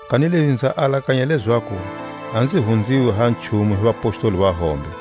Kanilezi nza alakanya lezaku a nzi hunziwi ha nchumu hi vapostoli lava va hombe.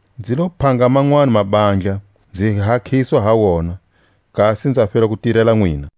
Nzi lo phanga manwani mabandla, nzi hakhiswa ha wona, kasi nza fela ku tirela nwina.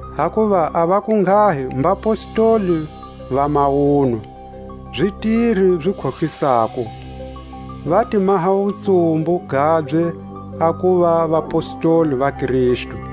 Hakuva a vakunghahi mbapostoli va mawunwa, zitiri zi khohlisako, va ti maha wutsumbu gabye a kuva vapostoli va Kristu.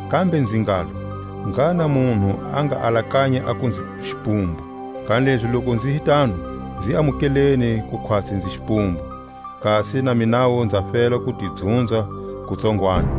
Kambe nzi ngalo: Ngha na munhu a nga alakanyi aku nzi xipumbu, kanilezi loku nzi hi tano, nzi amukeleni ku khwatsi nzi xipumbu, kasi na minawu nza fela ku ti dzunza kutsongwani,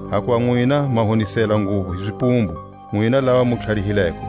Hakuva nwina ma honisela nguvu hi zipumbu, nwina lava mu tlharihileko!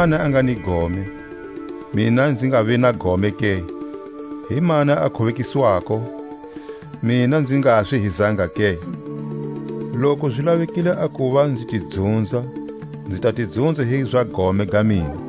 Himani a nga ni gome, mina nzi ngavi na gome ke? Himani a khubekiswako, mina nzi ngaswi hi zanga ke? Loku zi lavekile a kuva nzi ti dzunza, nzi ta ti dzunza hi za gome ga mina.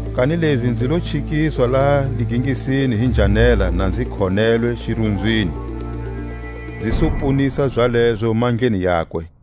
kanilezi nzi lo chikiswa laha ligingisini hi njhanela na nzi khonelwe xirunzwini, nzi su ponisa zalezo mandleni yakwe.